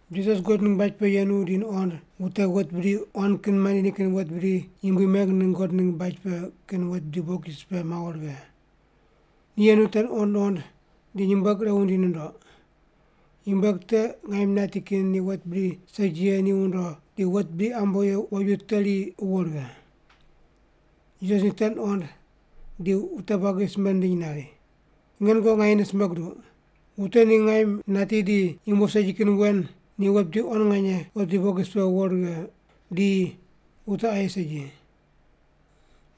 Jisas God ningg baj pe yenu di nuqond wute wet bidi quan kin mandi nikin wet bidi Yumbui meng ningg God ningg baj pe kin wet bidi bokis pe mawo righe. Ni yenu te nuqond nuqond di nyumbueg ire wundi nundoq. Nyumbueg te ngaim nati kin ni wet bidi segi ye ni wundo di wet bidi ambo ye woju teri wuwo righe. Jisas ni te nuqond di wute buagi simbe nindiny nari, “Nge nungoqi nganyene simbe guduq, wute ni ngaim nati di yumbo segi kin wen ni wet bidi quan nganye wet bidi bokis pe wuwo righe, di wute aye segi.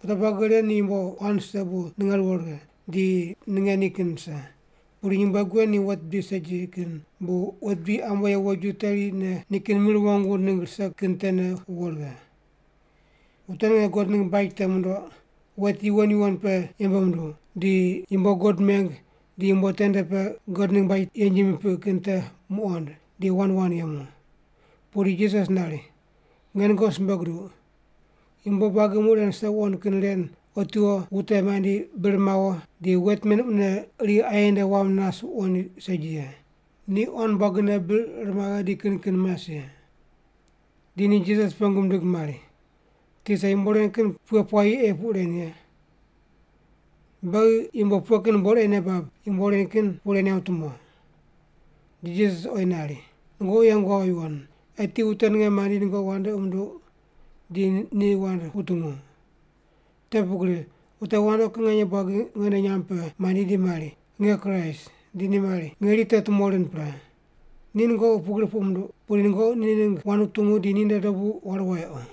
Wute buagi ren ni yumbo quan rise bu ninge ruwo righe di ninge nikin rise. Pudi nyumbueg wen ni wet bidi segi kin bu wet bidi ambo ye woju terine nikin mir wong wund ningg rise kin tene wuwo righe.” Wute ninge God ningg baj te mundoq, wet yuwon yuwon pe yembe munduw, di yumbo God meng di yumbo tende pe God ningg baj yenji mipiq kin te muqond di wand wand yemu. Pudi Jisas nari, “Nge nungoqi simbe guduq, yumbo buagi muq ren rise wuqond kin ren otiwo wute mandi bir mawo di wet men mune iri aye nde wam nas wuqoind segi ye. Ni quan buagine bir ir maghe di kin kin mas ye.” Di ni Jisas pengu mindig mari, “Tisa, yumbo ren kin pughe puayi ei puq ren ye? Beghi yumbo ur pughe kin buqod ei nei bab yumbo ren kin puq ren yamb tumo?” Di Jisas ni oyi nari, “Nungoqi yeng wawo yuwon. Eti wute ninge mandi nungoqi wandoqi munduq di ni wand wutungu. Te pugri wute wandoqi kin nganye buagi nge nde nyamb pe mandi di mari, ‘Nge Kraist’ di mari, ‘Ngeri te tumo rind pre.’ Ni nungoqi pugri puq munduq, pudi nungoqi ni ningg wand wutungu di ninde dobu waru wayequ.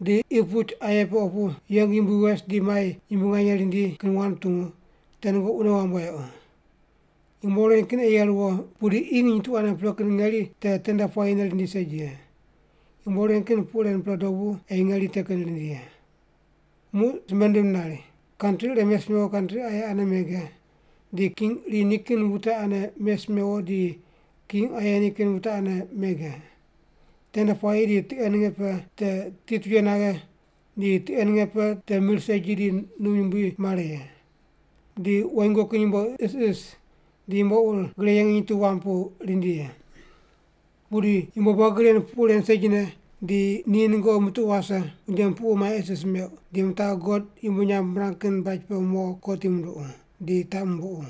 Di qi puch aye pe opu yeng yumbui wes di mai yumbui nganye rindi kin wand wutungu, te nungoqi wune wamb wayequ. Yumbo ren kin ei ye ruwo ye, pudi qi nginy tu ane pre kin ngeri te tende puayine rindi segi ye. Yumbo ren kin puq ren pre dobu ei ngeri te kin rindi ye.” Muq simbe nindim nari, “Kantri ire mes mewo kantri aye ane mege, di king iri nikin wute ane mes mewo di king aye nikin wute ane mege. Tende puayi di tiqe ninge pe te titwuye naghe di tiqe ninge pe te mir segi di num yumbui mare ye. Di woingo kin yumbo isis di yumbo ur gre ye nginy tu wam pu rindi ye. “Pudi yumbo buagi ren puq ren segine di ni nungoqi mutuqu wase, unje mupuqu mai isis meuq, di mitaqu God yumbui nyamb mirang kin baj pe mo kotim munduqu, di taq mumbuqu.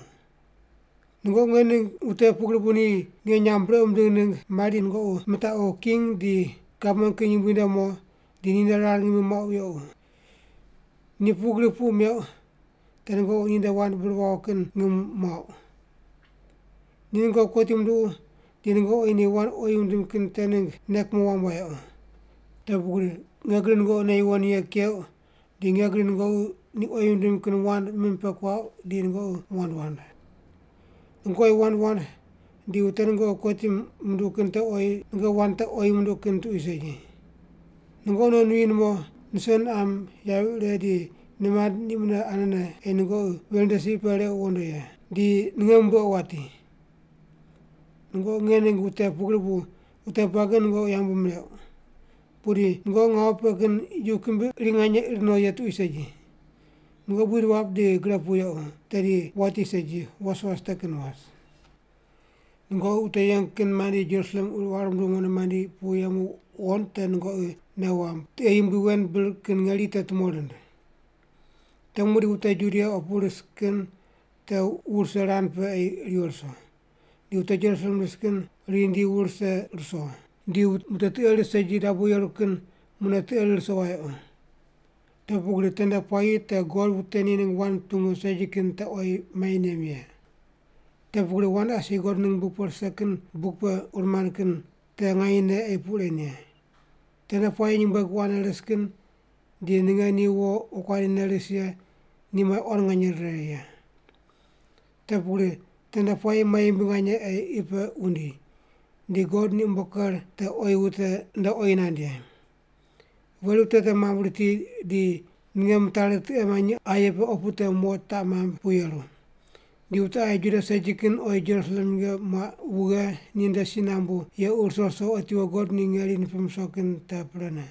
Nungoqi nge ningg wute pugri bu ni nge nyamb brequ mindigh ningg mari di nungoqi mitaqu king di gavman kin yumbui nde mo, di ninde rar ngimi muaqu yequ. Ni pugri puq meuq te nungoqi ninde wand bir wawo kin ngim muauq. Ni nungoqi kotim munduqu di nungoqi oyi ni wand oyi wundim kin te ningg nei kumo wamb wayequ. Te pugri nge gri nungoqi nei yuwon ye keuq di nge gri nungoqi ni oyi wundim kin wand mim pe kuauq di nungoqi wand wand. Nungoqi oyi wand wand di wute nungoqi kotim munduqu kin te oyi nungoqi wand te oyi munduq kin tuqui segi. Nungoqi non nuyi numo, nuse niqam, yavi ire di nimand ni mune anene ei nungoqi veri nde si pe requ wondo, di ninge rumbuequ wati. Nungoqi nge ningg wute pugri bu wute buagi nungoqi yambu mirequ. Pudi nungoqi ngawu pe kin yu kimbi iri nganye ir no ye tuqui segi. Nungoqi buid wap di gre pu yequ tedi wati segi, was was te kin was. “Nungoqi wute yeng kin mandi Jerusalem quir quar munduw mondo mandi pu yemu wuqond te nungoqi nei wamb tiqe yumbui wen bir kin ngeri te tumo rind. Te muqdi wute Judia opu ris kin te wu rise rand pe ei riwo ruso. Di wute Jerusalem ris kin riyi rindi wu rise ruso, di wute tiqe ris segi dabo yeru kin mune tiqe rir ruso wayequ. Te pugri tende puayi te God wute ni ningg wand mutungu segi kin te oyi mai nem ye. Te pugri wand asi God ningg wand rise kin buk pe ur mand kin te nganyene ei puq ren ye. Tende puayi nyumbueg wo ane ris kin di ninge ni wo wokuandi ne ris ye ni mai quan nganye rire ye. Te pugri tende puayi mai yumbui nganye ei qi pe wundi, di God ni umbo ker te oyi wute nde oyi nand ye. Veri wute te mambui riti di ninge mitari tiqe manyi aye pe opu te mo taq mamb pu yeru. Di wute aye Juda segi kin oyi Jerusalem nyinge muaq wughe ninde si nambu yequ ruso ruso otiwo God ni ngeri nipim ruso kin te prene.”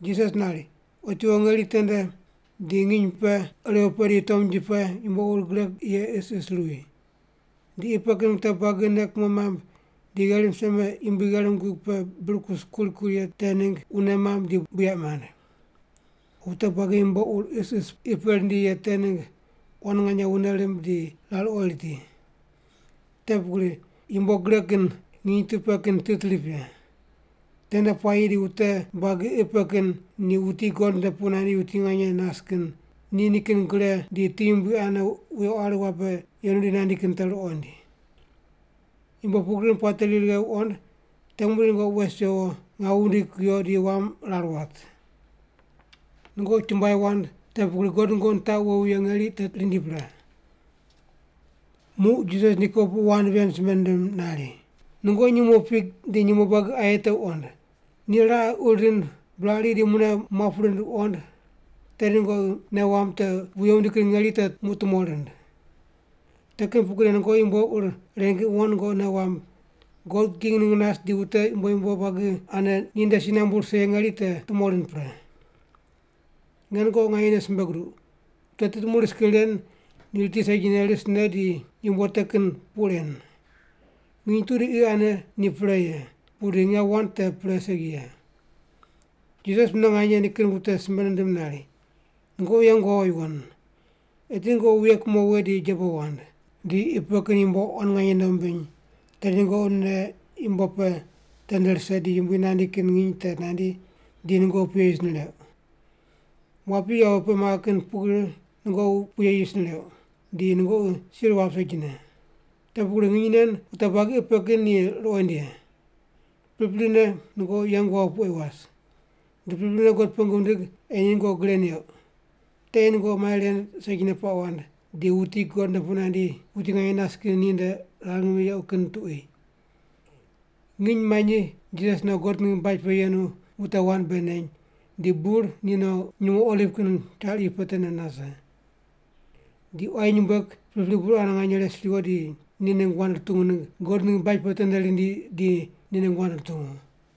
Jisas nari, “Otiwo ngeri tende di nginy pe, irew pe di tomnji pe yumbo ur gre ye isis ruwi. Di qi pe kin wute buagi nei kumo mamb di gherim seme yumbui gherim gug pe bir kus kuri kuri ye te ningg wune mamb di buyaq mand. Wute buagi yumbo ur isis qi pe rindi ye te ningg quan nganye wune rimb di rar ori riti. Te pugri yumbo gre kin nginy tu pe kin tit rip ye. Tende puayi di wute buagi qi pe kin ni wuti God nde pu nandi wuti nganye nas kin ni nikin gre di ti yumbui ane wuye quari wabe yenu di nandi kin te ruqoind. Yumbo pugri kin puate ri righe wuqond te muqdi nungoqi wes wewo ngawu wundigi kuyo di wam rar wat. Nungoqi chumbuai wand, te pugri God nungoqi nitaqu wowi ye ngeri te rindi pre.” Muq Jisas ni kopuqu wand ven simbe nindim nari, “Nungoqi nyumo fig di nyumo buagi aye te wuqond. Ni raqe uri rind buraq ri di mune muap rind wuqond, tedi nungoqi nei wamb te wuye wundi kin ngeri te muq tumo rind. Te kin pugrine nungoqi yumbo ur ren kin wuqond nungoqi nei wamb God king ningg nas di wute yumbo yumbo buagi ane ninde si nambu rise ye ngeri te tumo rind pre. “Nge nungoqi nganyene simbe guduq, wute tit muq ris kin ren ni riti segi, risne di yumbo te kin puq ren. Nginy tu di qi ane ni pre ye, pudi nge wand te pre segi ye.” Jisas mune nganye nikin wute simbe nindim nari, “Nungoqi yeng wawo yuwon. Eti nungoqi wuye kumo we di jebo wand. Di qi pe kin yumbo quan nganye nei wumbiny, tedi nungoqi nei yumbo pe tende rise, di Yumbui nandi kin nginy te nandi di nungoqi puye yis nireuq. Wapi yawi pe maghe kin pugri nungoqi puye yis nireuq, di nungoqi sir wap segine. Te pugri nginy nen wute buagi qi pe kin ni ruqoind ye. Priprine nungoqi yeng wawo pu ei was. Di priprine God pengu wundig ei ni nungoqi gre neuq. Te ei nungoqi mai ren segine puaq wand, di wuti God nde pu nandi wuti nganye nas kin ni nde rar ngimi yequ kin tuqui.” Nginy manyi Jisas no God ningg baj pe yenu wute wand bei neny, di bur ni no nyumo Oliv kin char iyu pe tende nase. Di quayi nyumbueg pripri burane nganye res riwo di ni ningg wand rutungu ningg God ningg baj pe tende rindi di ni ningg wand rutungu.